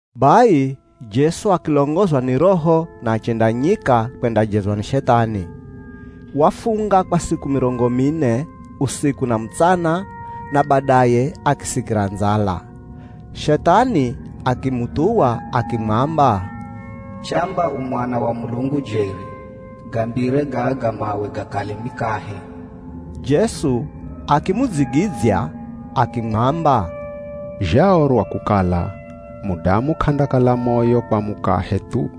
Bai Jesu akilongozwa ni Roho na achenda nyika kwendajezwa ni Shethani. Wafunga kwa siku mirongo mine, usiku na mutsana na badaye akisikira ndzala. Shethani akimuthuwa akimwamba, “Chamba u Mwana wa Mulungu jeri, gambire gaga mawe gakale mikahe.” Jesu akimudzigidzya akimwamba, “Zhaorwa kukala, ‘Mudamu k'andakala moyo kwa mukahe thu,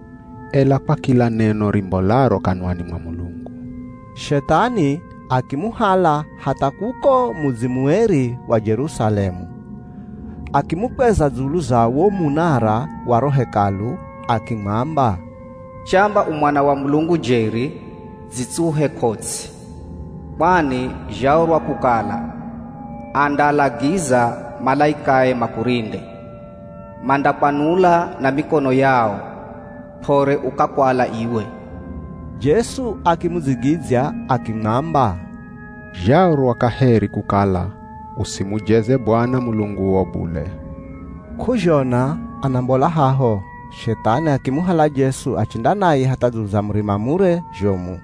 ela kwa kila neno rimbolaro kanwani mwa Mulungu.’” Shethani akimuhala hatha kuko mudzi mueri wa Jerusalemu, akimukweza dzulu za wo munara wa ro Hekalu, akimwamba, “Chamba u Mwana wa Mulungu jeri, dzitsuhe ko ts'i, kwani zhaorwa kukala, ‘Andaalagiza malaikae makurinde, mandakwanula na mikono yao, p'ore ukakwala iwe.’” Jesu akimudzigidzya akimwamba, “Zhaorwa kaheri kukala, ‘Usimujeze Bwana Mulunguo bule!’” K'uzhona anambola haho, Shethani akimuhala Jesu achenda naye hatha dzulu za murima mure zhomu.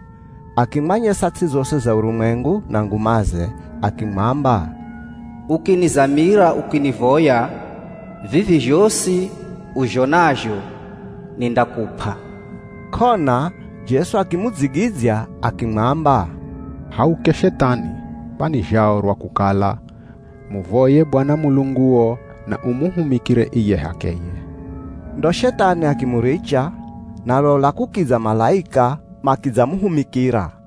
Akimwanyesa ts'i zosi za urumwengu na ngumaze. Akimwamba, “Ukinizamira ukinivoya, vivi zhosi uzhonazho nindakup'a.” K'ona Jesu akimudzigidzya akimwamba, “Hauke Shethani, kwani zhaorwa kukala, ‘Muvoye Bwana Mulunguo na umuhumikire iye h'akeye!’” Ndo Shethani akimuricha, na lola kukidza malaika makidzamuhumikira.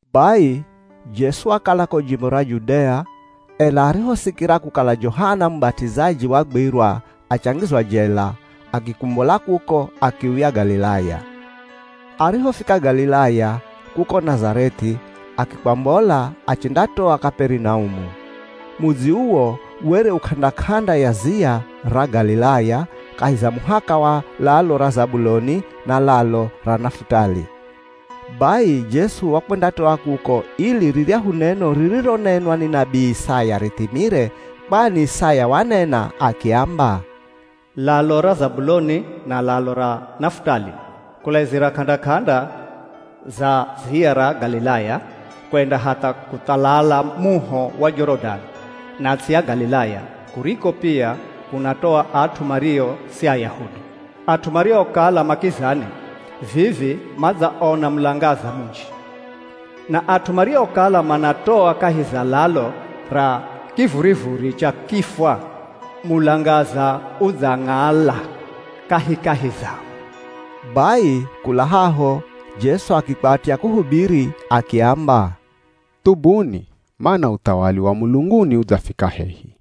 Bai Jesu wakala ko jimbo ra Judea, ela arihosikira kukala Johana Mubat'izaji wagwirwa achangizwa jela, akikumbola kuko, akiuya Galilaya. Arihofika Galilaya, kuko Nazareth'i akikwambola, achendatoa Kaperinaumu. Mudzi uwo, were u k'anda-k'anda ya ziya ra Galilaya, kahi za muhaka wa lalo ra Zabuloni na lalo ra Nafutali. Bai Jesu wakwendatoa kuko, ili riryahu neno ririronenwa ni nabii Isaya rithimire. Kwani Isaya wanena akiamba, “Lalo ra Zabuloni na lalo ra Nafutali, kulaizira k'anda-k'anda za ziya ra Galilaya, kwenda hatha kuthalala muho wa Jorodani, na ts'i ya Galilaya, kuriko pia kunatoa at'u mario si Ayahudi, at'u mariokala ma kizani, vivi madzaona mulangaza munji. Na at'u mariokala manatoa kahi za lalo ra kivurivuri cha kifwa mulangaza udzang'ala kahikahi zao.” Bai kula haho Jesu akikwatya kuhubiri akiamba, “Thubuni, mana uthawali wa mulunguni udzafika hehi.”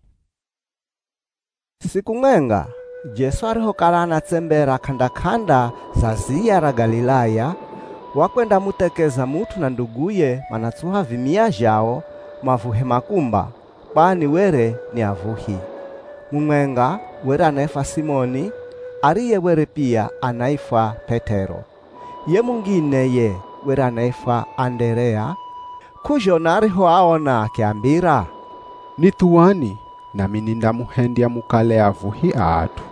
Siku mwenga, Jesu arihokala anatsembera k'anda-k'anda za ziya ra Galilaya, wakwendamuthekeza mut'u na nduguye manatsuha vimia zhao mavuhe makumba, kwani were ni avuhi. Mumwenga were anaifwa Simoni, ariye were pia anaifwa P'et'ero. Ye mungine ye were anaifwa Anderea. K'uzhona arihoaona akiambira, “Nithuwani, nami nindamuhendya mukale avuhi a at'u.”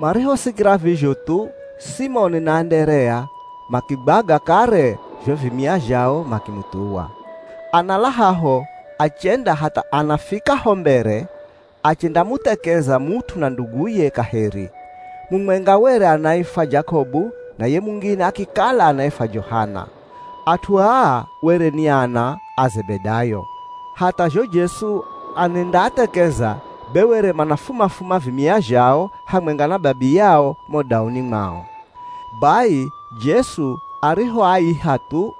Marihosikira vizho thu, Simoni na Anderea makigwaga kare zho vimia zhao makimuthuwa. Anala haho achenda hatha anafika ho mbere, achendamuthekeza mut'u na nduguye kaheri. Mumwenga were anaifwa Jakobu, na ye mungine akikala anaifwa Johana. At'u aa were ni ana a Zebedayo. Hatha zho Jesu anendaathekeza, be were manafuma-fuma vimia zhao hamwenga na babiyao mo dauni mwao. Bai Jesu arihoaiha thu,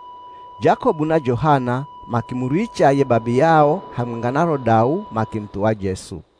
Jakobu na Johana makimuricha ye babiyao hamwenga na ro dau makimuthuwa Jesu.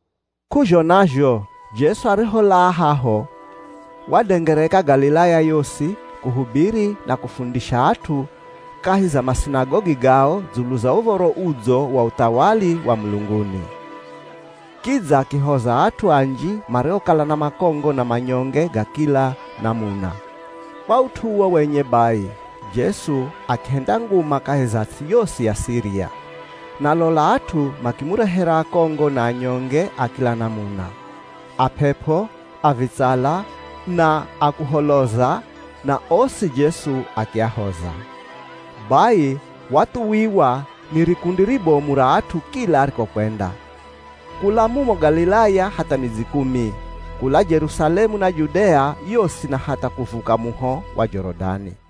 K'uzhona zho Jesu ariholaa haho, wadengereka Galilaya yosi, kuhubiri na kufundisha at'u kahi za masinagogi gao dzulu za Uv̱oro Udzo wa uthawali wa mulunguni. Kidza akihoza at'u anji mariokala na makongo na manyonge ga kila namuna. Kwa ut'u uwo wenye bai, Jesu akihenda nguma kahi za ts'i yosi ya Siria. Na lola at'u makimurehera akongo na anyonge a kila namuna. A p'ep'o, a vitsala, na akuholoza, na osi Jesu akiahoza. Bai wathuwiwa ni rikundi ribomu ra at'u kila arikokwenda. Kula mumo Galilaya hatha Midzi Kumi. Kula Jerusalemu na Judea yosi na hatha kuvuka muho wa Jorodani.